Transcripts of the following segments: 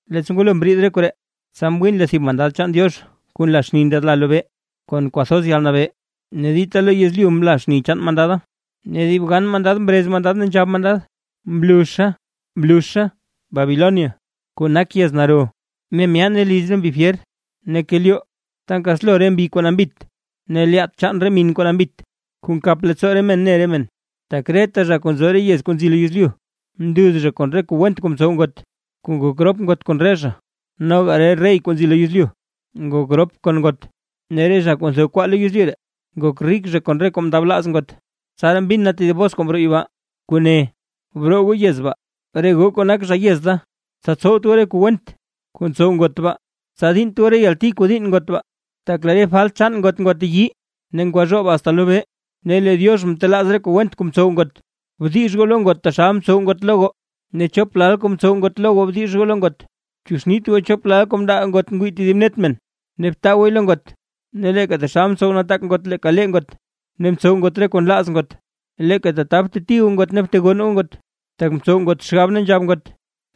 Leettsa ngwalo mriid re koree, tsa mwiin lee tedib mandad chaan Diox kuu nla xni ndyaadla lobee, kon kwathoz yalnabee, ne dita lo yezlyu mla xni chaan mandada. Ne dib gan mandad mrez mandad ne nzhab mandad: ―¡Mluzha, mluzha Babilonia, kuu nak yez naro! ¡Ne myaane liz re mbi fyer, ne kelyoo ta nkaslo re mbi kuu nambit, ne lyaat chaan re min kuu nambit, kuu nkap leettsoo men ne men! Tak reta zha kuu nzo re yez kuu nzi lo yezlyu, mnduz zha kon re kuu went kuu mtsow ngot, kuu ngok rop ngot kon re zha. Noga re rey kuu nzi lo yezlyu ngok rop kon ngot, ne re zha kuu ntho re kwaa lo yezlyu ree, ngok rik zha kon re kuu mndablaaz ngot. Tsaraa mbin na tedib bos kuu mroo yibaa, kuu ne: ―Broo goo yez baa, re goo kuu nak zha yez da, tsa tsowt goo re kuu went kuu ntsow ngot baa, tsa diinnt goo re yalti kuu diinn ngot; tak lee re falt chaan ngot ngwateyii ne ngwazhoob asta lobee, ne lee Diox mtelaaz re kuu went kuu mtsow ngot. Bdix goo lo ngot taxal mtsow ngot lo goo; ne chop lal kuu mtsow ngot lo goo bdix goo lo ngot. Bchuuxnit goo chop lal kuu mndaa ngot ngwii tedib net men, ne btaa gooy lo ngot. Ne leeka taxal mtsow nataak ngot leeka lee ngot, ne mtsow ngot reta kuu nlaaz ngot, leeka tata bteti goo ngot ne btegonn goo ngot; tak ntsow ngot xgab ne nzhab ngot: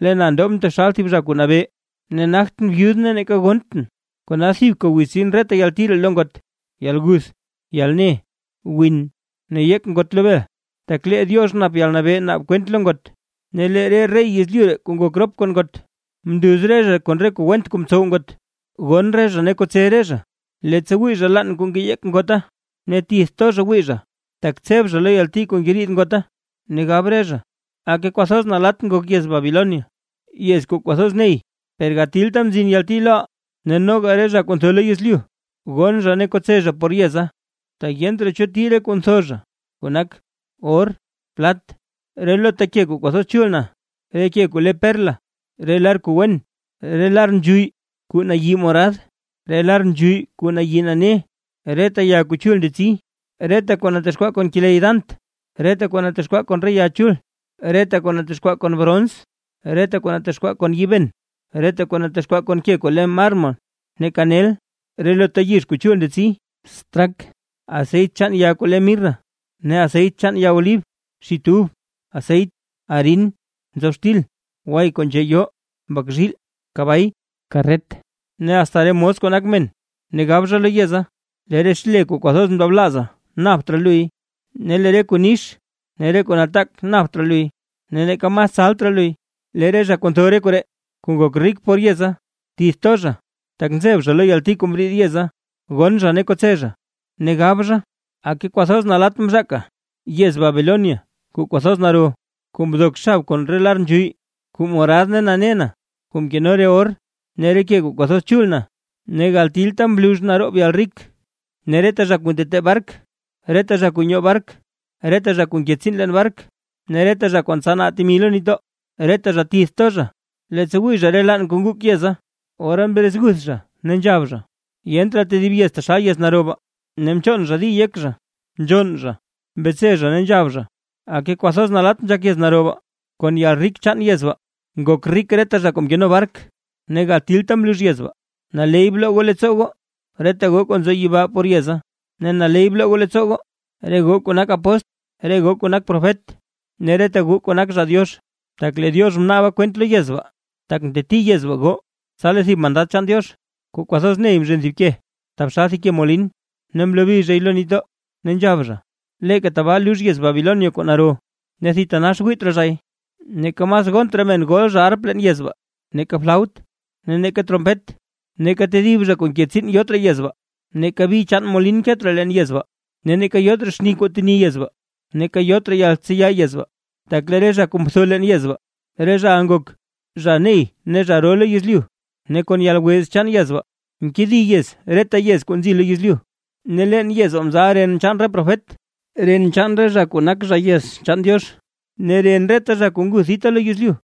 “Lee na ndobʼn taxal thib zha kuu nabee, ne nagtʼn byud ne neeka gonntʼn”. Kona thibka wiz tsin reta yalti ree lo ngot, yalguth, yalne, win ne yeek ngot lo bel; tak lee Diox nap yalnabee naab kwent lo ngot. Ne lee re rey yezlyu ree kuu ngok rop kon ngot, mnduz re zha kon re kuu went kuu mtsow ngot, gonn re zha ne kotse re zha, leettsa wii zha laann kuu ngeyeek ngota. Ne tith to zha wii zha, tak tseb zha lo yalti kuu ngeriid ngota, ne gab re zha: ―¡Aka! ¡Kwathoz nalatt ngok yez Babilonia, yez kuu kwathoz ney! Per gatilta mzin yalti loʼa. Ne noga re zha kuu ntho lo yezlyu gonn zha ne kotse zha por yeza, tak yent raa cho tii re kuu ntho zha; kuu nak: or, plat, relota ke kuu kwathoz chul na, re ke kuu le perla, re lar kuu wen, re lar nzhuyy kuu nayi morad, re lar nzhuyy kuu nayi nane, reta ya kuu chul ndetsi, reta kuu natexkwaa kon keley dant, reta kuu natexkwaa kon re ya chul, reta kuu natexkwaa kon brons, reta kuu natexkwaa kon yiiben, reta kuu natexkwaa kon ke kuu le mármol, ne kanel, relota yizh kuu chul ndetsi, straak, aseyt chaan ya kuu le mirra, ne aseyt chaan ya olib, xit ub, aseyt, arin, nzob xtil, way kuu nzhee yoo, mbak zhiil, kabay, karret ne asta re mos kuu nak men. Ne gab zha lo yeza: ―Lee re xle kuu kwathoz mndablaaza napt raa luy, ne lee re kuu nix ne re kuu nataak napt raa luy, ne neeka mas tsalt raa luy. Lee re zha kuu ntho re koree, kuu ngok rik por yeza, tith to zha, tak nzeb zha lo yalti kuu mriid yeza, gonn zha ne kotse zha, ne gab zha: ―¡Aka! ¡Kwathoz nalatt mzhaka yez Babilonia kuu kwathoz naro! Kuu mdok xab kon re lar nzhuyy kuu morad ne nane na, kuu mkeno re or ne re ke kuu kwathoz chul na. ¡Ne gatilta mlux naroob yalrik! Ne reta zha kuu ntetee bark, reta zha kuu nyoo bark, reta zha kuu nke tsiin leen bark ne reta zha kuu ntsanaa temi lo nitdoo, reta zha tith to zha; leettsa mwii re zha laann kuu nguk yeza, ora mrezguth zha ne nzhab zha: ―¡Yent raa tedib yez taxal yez naro baa! Ne mchoon zha di yek zha, nzhonn zha, mbetse zha ne nzhab zha: ―¡Aka! ¡Kwathoz nalatt nzhak yez naro baa! Kon yalrik chaan yez baa, ngok rik reta zha kuu mkeno bark. ¡Ne gatilta mlux yez baa! Naley bloo goo leettsoo goo, reta goo kuu nzo yibaa por yez baa, ne naley bloo goo leettsoo goo, re goo kuu nak apóstl, re goo kuu nak profet ne reta goo kuu nak zha Diox; tak lee Diox mnaaba kwent lo yez baa, tak mteti yez baa goo. Tsa lee thib mandad chaan Diox kuu kwathoz ney mzhen thib ke, taxal thib ke molin, ne mlobi zhay lo nitdoo, ne nzhab zha: ―Leeka tabaa lux yez Babilonia kuu naro, ne thitanax wiit raa zhay. Neeka mas gont raa men gol zha arp leen yez baa, neeka flaut, ne neeka trompet; neeka tedib zha kuu nke tsiin yot raa yez baa, neeka bi chaan molin ket raa leen yez baa. Ne neeka yot raa xni kuu teni yez baa, neeka yot raa yaltseya yez baa, tak lee re zha kuu mtho leen yez baa, re zhaʼa ngok zha ney ne zha ro lo yezlyu, ne kon yalwez chaan yez baa, mkedi yez reta yez kuu nzi lo yezlyu. Ne leen yez baa mzal ren chaan re profet, ren chaan re zha kuu nak zha yez chaan Diox, ne ren reta zha kuu nguth dita lo yezlyu.